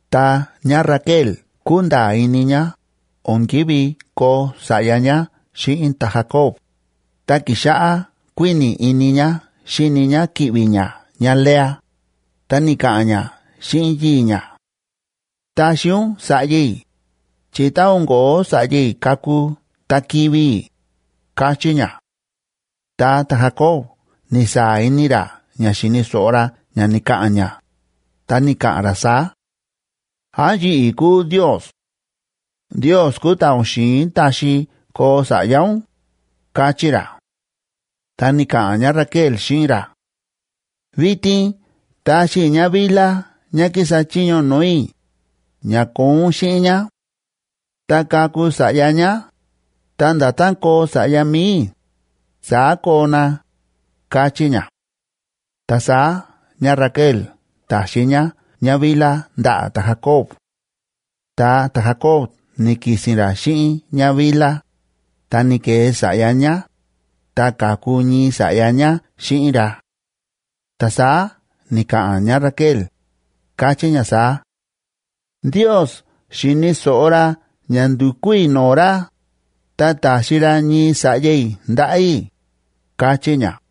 Tá ñáRaquel kúnda̱a̱ ini ñá o̱n ki̱ví koo sa̱ꞌya ñá xíꞌin ta̱Jacob, ta ki̱xáꞌá kuíni̱ ini ñá xíni ñá ki̱ꞌvi̱ ñá ñáLea, ta ni̱ka̱ꞌa̱n ñá xíꞌin yii̱ ñá: ―Taxi ún sa̱ꞌya i̱, chi tá o̱n kóo sa̱ꞌya i̱ kaku ta kivi̱ i̱ ―káchí ñá. Ta ta̱Jacob ni̱saa̱ ini ra ña xi̱ni̱ so̱ꞌo ra ña ni̱ka̱ꞌa̱n ñá, ta ni̱ka̱ꞌa̱n ra saá: ―¿Án yi̱ꞌi̱ kúu Ndios? Ndios kúu ta̱ o̱n xi̱in taxi koo sa̱ꞌya ún ―káchí ra. Ta ni̱ka̱ꞌa̱n ñáRaquel xíꞌin ra: ―Vitin taxi i̱ ñáBilha ñá kísa chiño no̱o̱ i̱, ña koo ún xíꞌin ñá. Tá kaku sa̱ꞌya ñá, ta nda̱tán koo sa̱ꞌya mi̱i i̱, saá koo na ―káchí ñá. Ta saá ñáRaquel ta̱xi ñá ñáBilha ndaꞌa̱ ta̱Jacob. Ta ta̱Jacob ni̱ki̱si̱n ra xíꞌin ñáBilha, ta ni̱ke̱e sa̱ꞌya ñá, ta ka̱ku ñii sa̱ꞌya ñá xíꞌin ra. Ta saá ni̱ka̱ꞌa̱n ñáRaquel, káchí ñá saá: “Ndios xi̱ni̱ so̱ꞌo ra ña ndu̱kú i̱ no̱o̱ ra, ta ta̱xi ra ñii sa̱ꞌya i̱ ndaꞌa̱ i̱”, káchí ñá.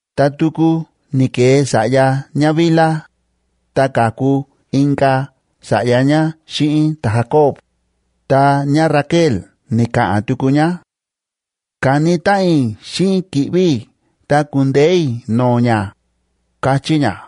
Ta tuku ni̱ke̱e sa̱ꞌya ñáBilha, ta ka̱ku inka̱ sa̱ꞌya ñá xíꞌin ta̱Jacob, ta ñáRaquel ni̱ka̱ꞌa̱n tuku ñá: “Ka̱ni táꞌan i̱ xíꞌin ki̱ꞌvi̱ i̱ ta ku̱ndeé i̱ no̱o̱ ñá”, káchí ñá.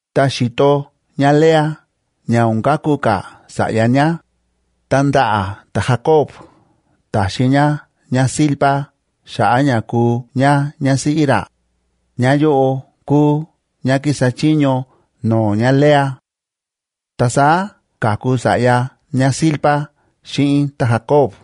Ta xi̱to ñáLea ña o̱n kaku ka̱ sa̱ꞌya ñá, ta ndaꞌa̱ ta̱Jacob ta̱xi ñá ñáZilpa xa̱ꞌa̱ ña kuu ñá ñásíꞌí ra, ñáyóꞌo kúu ñá kísa chiño no̱o̱ ñáLea. Ta saá ka̱ku sa̱ꞌya ñáZilpa xíꞌin ta̱Jacob,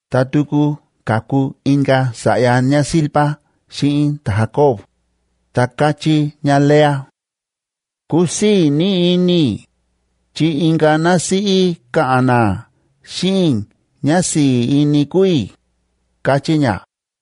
Ta tuku ka̱ku inka̱ sa̱ꞌya ñáZilpa xíꞌin ta̱Jacob, ta káchí ñáLea: “Kúsii̱ ní ini i̱. Chi inka̱ násíꞌí ka̱ꞌa̱n ná xíꞌin i̱ ñá si̱i̱ ini kúu i̱”, káchí ñá.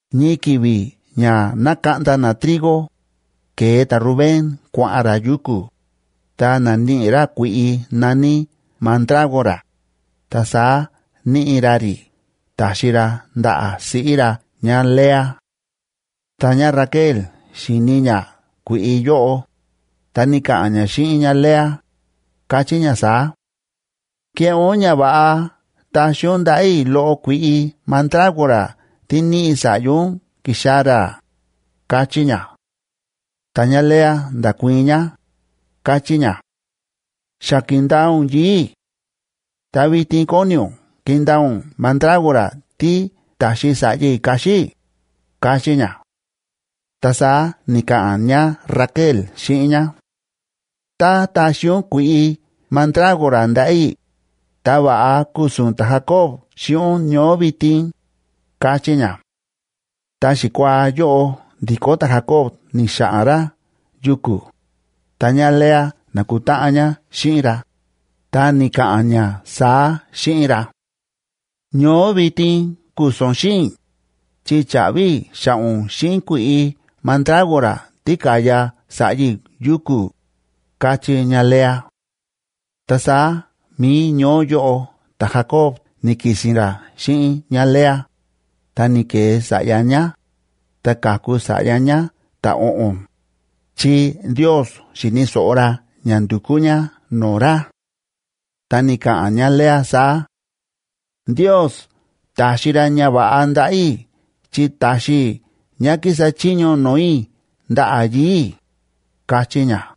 Ñii ki̱vi̱ ña nákaꞌnda na trigo, ke̱e ta̱Rubén kua̱ꞌa̱n ra yuku̱, ta na̱níꞌi ra kui̱ꞌi na̱ní mandrágora,e ta saá níꞌi ra rí ta̱xi ra ndaꞌa̱ siꞌí ra ñáLea. Tá ñáRaquel xi̱ni ñá kui̱ꞌi yóꞌo, ta ni̱ka̱ꞌa̱n ñá xíꞌin ñáLea, káchí ñá saá: ―Keꞌé ún ñava̱ꞌa taxi ún ndaꞌa̱ i̱ loꞌo kui̱ꞌi mandrágora tí níꞌi sa̱ꞌya ún ki̱xaa̱ ra ―káchí ñá. Ta ñáLea nda̱kuii̱n ñá, káchí ñá: ―Xa ki̱ndaa ún yii̱ i̱. Ta vitin kóni ún kindaa ún mandrágora tí ta̱xi sa̱ꞌya i̱ kaxi i̱ ―káchí ñá. Ta saá ni̱ka̱ꞌa̱n ñáRaquel xíꞌin ñá: ―Tá taxi ún kui̱ꞌi mandrágora ndaꞌa̱ i̱, ta va̱ꞌa ku̱su̱n ta̱Jacob xíꞌin ún ñoó vitin ―káchí ñá. Ta xikuaa yóꞌo ndi̱kó ta̱Jacob ni̱xa̱ꞌa̱n ra yuku̱, ta ñáLea na̱kutáꞌan ñá xíꞌin ra, ta ni̱ka̱ꞌa̱n ñá saá xíꞌin ra: ―Ñoó vitin ku̱su̱n ún xíꞌin i̱, chi cha̱ꞌvi i̱ xa̱ꞌa̱ ún xíꞌin kui̱ꞌi mandrágora tí ka̱ya sa̱ꞌya i̱ yuku̱ ―káchí ñáLea. Ta saá mi̱i ñoó yóꞌo ta̱Jacob ni̱ki̱si̱n ra xíꞌin ñáLea, ta ni̱ke̱e sa̱ꞌya ñá, ta ka̱ku sa̱ꞌya ñá ta̱o̱ꞌo̱n, chi Ndios xi̱ni̱ so̱ꞌo ra ña ndu̱kú ñá no̱o̱ ra. Ta ni̱ka̱ꞌa̱n ñáLea saá: “Ndios ta̱xi ra ñava̱ꞌa ndaꞌa̱ i̱ chi ta̱xi i̱ ñá kísa chiño no̱o̱ i̱ ndaꞌa̱ yii̱ i̱”, káchí ñá.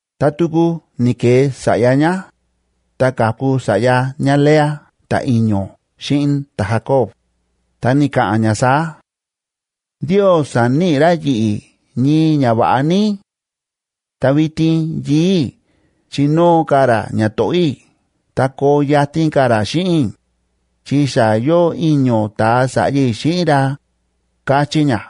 Ta tuku ni̱ke̱e sa̱ꞌya ñá, ta ka̱ku sa̱ꞌya ñáLea ta̱i̱ño̱ xíꞌin ta̱Jacob, ta ni̱ka̱ꞌa̱n ñá saá: “Ndios sa̱níꞌi ra yi̱ꞌi̱ ñii ñava̱ꞌa ní. Ta vitin yii̱ i̱ chinóo ka̱ ra ñato̱ꞌó i̱ ta koo yatin ka̱ ra xíꞌin i̱, chi xa yóo i̱ño̱ ta̱a sa̱ꞌya i̱ xíꞌin ra”, káchí ñá.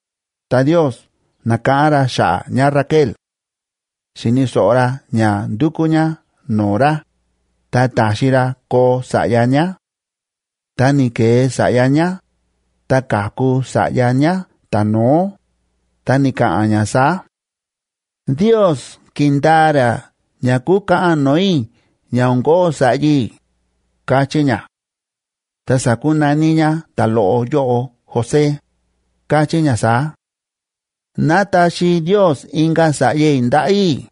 Ta Ndios na̱káꞌán ra xa̱ꞌa̱ ñáRaquel; xi̱ni̱ so̱ꞌo ra ña ndúkú ñá no̱o̱ ra, ta ta̱xi ra koo sa̱ꞌya ñá. Ta ni̱ke̱e sa̱ꞌya ñá, ta ka̱ku sa̱ꞌya ñá ta̱no̱ó, ta ni̱ka̱ꞌa̱n ñá saá: “Ndios ki̱ndaa ra ña kúkaꞌan no̱o̱ i̱ ña o̱n ko̱ó sa̱ꞌya i̱”, káchí ñá. Ta sa̱kunaní ñá ta̱loꞌo yóꞌo José,h káchí ñá saá: “Ná taxi Ndios inka̱ sa̱ꞌya i̱ ndaꞌa̱ i̱.”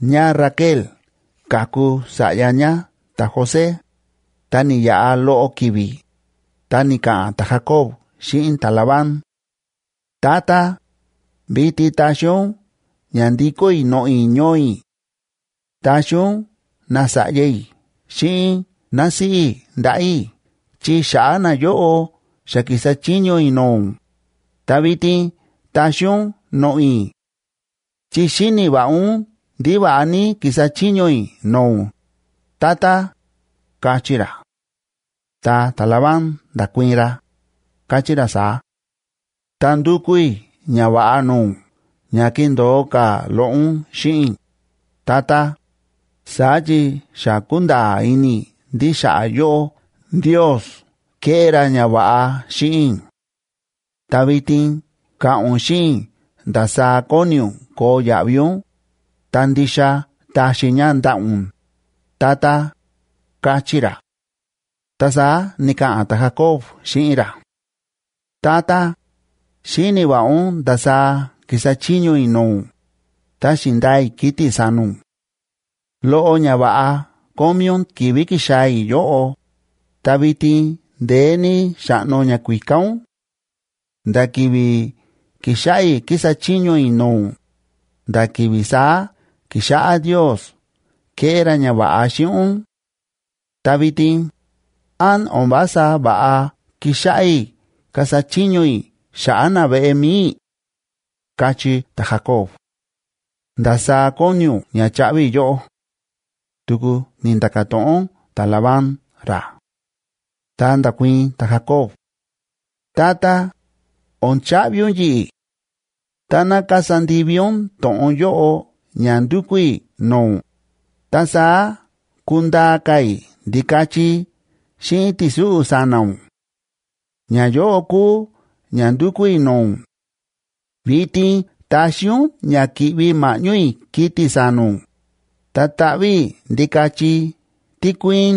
ÑáRaquel ka̱ku sa̱ꞌya ñá ta̱José, ta ni̱yaꞌa loꞌo ki̱vi̱, ta ni̱ka̱ꞌa̱n ta̱Jacob xíꞌin ta̱Labán: ―Tata, vitin taxi ún ña ndikó i̱ noꞌo̱ i̱ ñoo i̱. Taxi ún nasa̱ꞌya i̱ xíꞌin násíꞌí i̱ ndaꞌa̱ i̱ chi xa̱ꞌa̱ nayóꞌo xa ki̱sa chiño i̱ no̱o̱ ún, ta vitin taxi ún noꞌo̱ i̱. Chi xíni̱ va̱ꞌa ún ndí va̱ꞌa ní ki̱sa chiño i̱ no̱o̱ ún, tata ―káchí ra. Ta ta̱Labán nda̱kuii̱n ra, káchí ra saá: ―Ta ndúkú i̱ ñava̱ꞌa no̱o̱ ún ña kindo̱o ka̱ loꞌo ún xíꞌin i̱, tata. Saá chi xa kúnda̱a̱ ini i̱ ndí xa̱ꞌa̱ yóꞌó Ndiosi kéꞌé ra ñava̱ꞌa xíꞌin i̱. Ta vitin ka̱ꞌa̱n ún xíꞌin i̱ ndasaá kóni ún koo yaꞌvi ún, ta ndixa taxi i̱ ña ndaꞌa̱ ún, tata ―káchí ra. Ta saá ni̱ka̱ꞌa̱n ta̱Jacob xíꞌin ra: ―Tata, xíni̱ va̱ꞌa ún ndasaá ki̱sa chiño i̱ no̱o̱ ún, ta xi̱ndaa i̱ kiti̱ sa̱na̱ ún. Loꞌo ñava̱ꞌa kómí ún ki̱vi̱ ki̱xaa̱ i̱ yóꞌo, ta vitin ndeé ní xa̱ꞌno ñakuíká ún; nda̱ ki̱vi̱ ki̱xáꞌá i̱ kísa chiño i̱ no̱o̱ ún, nda̱ ki̱vi̱ saá ki̱xáꞌá Ndios kéꞌé ra ñava̱ꞌa xíꞌin ún; ta vitin, ¿án o̱n vása va̱ꞌa kixáꞌá i̱ kasa chiño i̱ xa̱ꞌa̱ naveꞌe mi̱i i̱? ―káchí ta̱Jacob. ―¿Ndasaá kóni ún ña chaꞌvi i̱ yóꞌó? ―tuku ni̱nda̱ka̱ to̱ꞌon ta̱Labán ra. Ta nda̱kuii̱n ta̱Jacob: ―Tata, o̱n chaꞌvi ún yi̱ꞌi̱. Táná kasa ndivi ún to̱ꞌon yóꞌo ña ndúkú i̱ no̱o̱ ún, ta saá kundaa ka̱ i̱ ndikachi xíꞌin ti̱súꞌu̱ sa̱na̱ ún. Ñayóꞌo kúu ña ndúkú i̱ no̱o̱ ún: vitin taxi ún ña ki̱ꞌvi ma̱ꞌñó i̱ kiti̱ sa̱na̱ ún, ta taꞌví i̱ ndikachi tí kuíín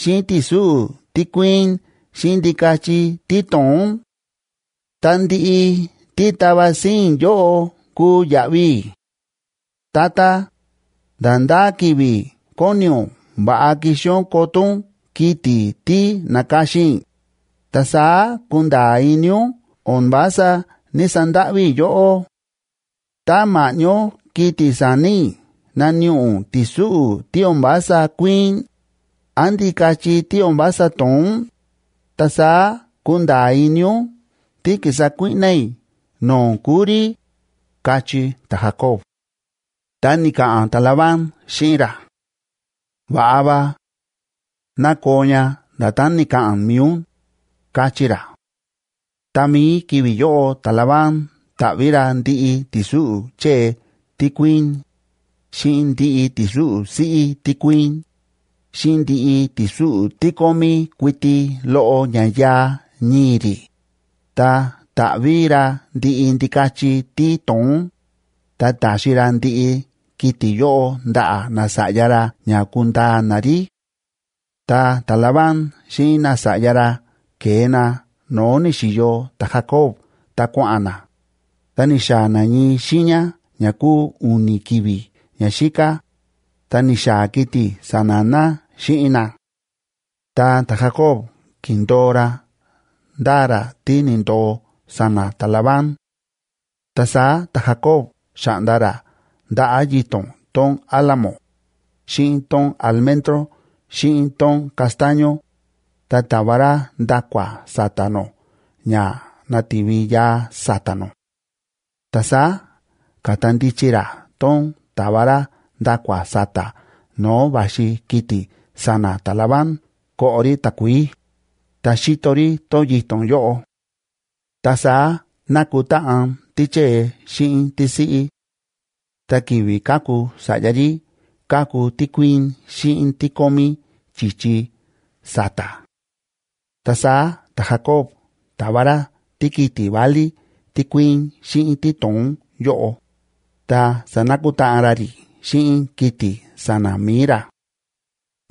xíꞌin ti̱súꞌu̱ tí kuíín xíꞌin ndikachi tí to̱ón. Ta ndiꞌi tí tava síín i̱ yóꞌo kuu yaꞌvi i̱. Tata, nda̱ ndá ki̱vi̱ kóni ún va̱ꞌa kixi ún koto ún kiti̱ tí na̱ka̱xin i̱, ta saá kunda̱a̱ ini ún o̱n vása ní‑sandáꞌví i̱ yóꞌó. Tá ma̱ꞌñó kiti̱ sa̱na̱ i̱ naníꞌi ún ti̱súꞌu̱ tí o̱n vása kuíín án ndikachi tí o̱n vása to̱ón, ta saá kunda̱a̱ ini ún tí ki̱sa kuíꞌná i̱ no̱o̱ ún kúu rí ―káchí ta̱Jacob. Ta ni̱ka̱ꞌa̱n ta̱Labán xíꞌin ra: ―Va̱ꞌa va. Ná koo ña nda̱tán ni̱ka̱ꞌa̱n mi̱i ún ―káchí ra. Tá mií ki̱vi̱ yóꞌo ta̱Labán ta̱ꞌví ra ndiꞌi ti̱súꞌu̱ chée tí kuíín, xíꞌin ndiꞌi ti̱súꞌu̱ siꞌí tí kuíín, xíꞌin ndiꞌi ti̱súꞌu̱ tí kómí kuiti loꞌo ña yaa ñii̱ rí, ta ta̱ꞌví ra ndiꞌi ndikachi tí to̱ón, ta ta̱xi ra ndiꞌi kiti̱ yóꞌo ndaꞌa̱ nasa̱ꞌya ra ña kundaa na rí. Ta ta̱Labán xíꞌin nasa̱ꞌya ra ke̱e na no̱o̱ ni̱xi̱yo ta̱Jacob ta kua̱ꞌa̱n na, ta ni̱xaa̱ na ñii xiiña ña kúu u̱ni̱ ki̱vi̱ ñaxíká, ta ni̱xaa̱ kiti̱ sa̱na̱ na xíꞌin na. Ta ta̱Jacob ki̱ndo̱o ra ndáa ra tí ni̱ndo̱o sa̱na̱ ta̱Labán. Ta saá ta̱Jacob xa̱ꞌnda ra ndaꞌa̱ yito̱n tón álamo, xíꞌin tón almendroj xíꞌin tón castaño, ta ta̱va ra nda̱kua̱ sa̱ta̱ nó ña nati̱vi yaa sa̱ta̱ nó. Ta saá káta ndichi ra tón ta̱va ra nda̱kua̱ sa̱ta̱ no̱o̱ va̱xi kiti̱ sa̱na̱ ta̱Labán koꞌo rí takuií, ta xíto rí tón yito̱n yóꞌo. Ta saá nákutáꞌan tíchée xíꞌin tísiꞌí; ta ki̱vi̱ kaku sa̱ꞌya rí ka̱ku tí kuíín xíꞌin tí kómí chi̱chi sa̱ta̱. Ta saá ta̱Jacob ta̱va ra tíkiti̱ válí tí kuíín xíꞌin tí to̱ón yóꞌo, ta sa̱nakutáꞌan ra rí xíꞌin kiti̱ sa̱na̱ mi̱i ra.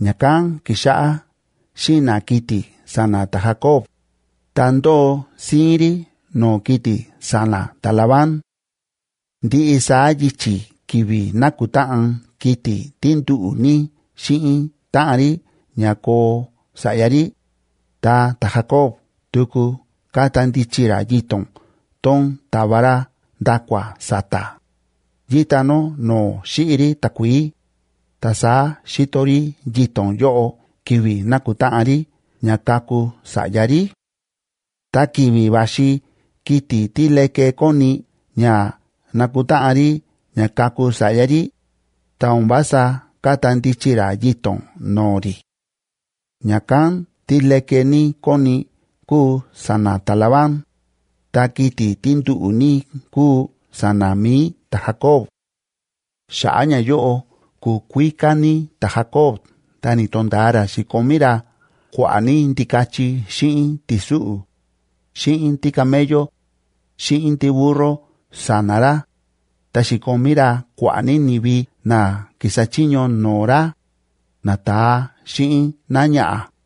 Ña̱kán ki̱xáꞌá xína̱ kiti̱ sa̱na̱ ta̱Jacob, ta ndóo síín rí no̱o̱ kiti̱ sa̱na̱ ta̱Labán. Ndiꞌi saá yichi̱ ki̱vi̱ nákutáꞌan kiti̱ tí nduꞌu̱ ní xíꞌin táꞌan rí ña koo sa̱ꞌya rí, ta ta̱Jacob tuku káta ndichi ra yito̱n tón ta̱va ra nda̱kua̱ sa̱ta̱, yíta nó no̱o̱ xíꞌi rí takuií, ta saá xíto rí yito̱n yóꞌo ki̱vi̱ nákutáꞌan rí ña kaku sa̱ꞌya rí. Ta ki̱vi̱ va̱xi kiti̱ tí leke kóni ña nakutáꞌan rí ña kaku sa̱ꞌya rí, ta o̱n vása káta ndichi ra yito̱n no̱o̱ rí. Ña̱kán tí leke ní kóni kúu sa̱na̱ ta̱Labán, ta kiti̱ tí nduꞌu̱ ní kúu sa̱na̱ mi̱i ta̱Jacob. Xa̱ꞌa̱ ñayóꞌo ku̱kuíká ní ta̱Jacob ta ni̱to̱nda̱a ra xi̱komí ra kua̱ꞌa̱ ní ndikachi xíꞌin ti̱súꞌu̱, xíꞌin tícamello, xíꞌin tíburro sa̱na̱ ra, ta xi̱komí ra kua̱ꞌa̱ ní ni̱vi na ki̱sa chiño no̱o̱ ra, nata̱a xíꞌin náñaꞌa̱.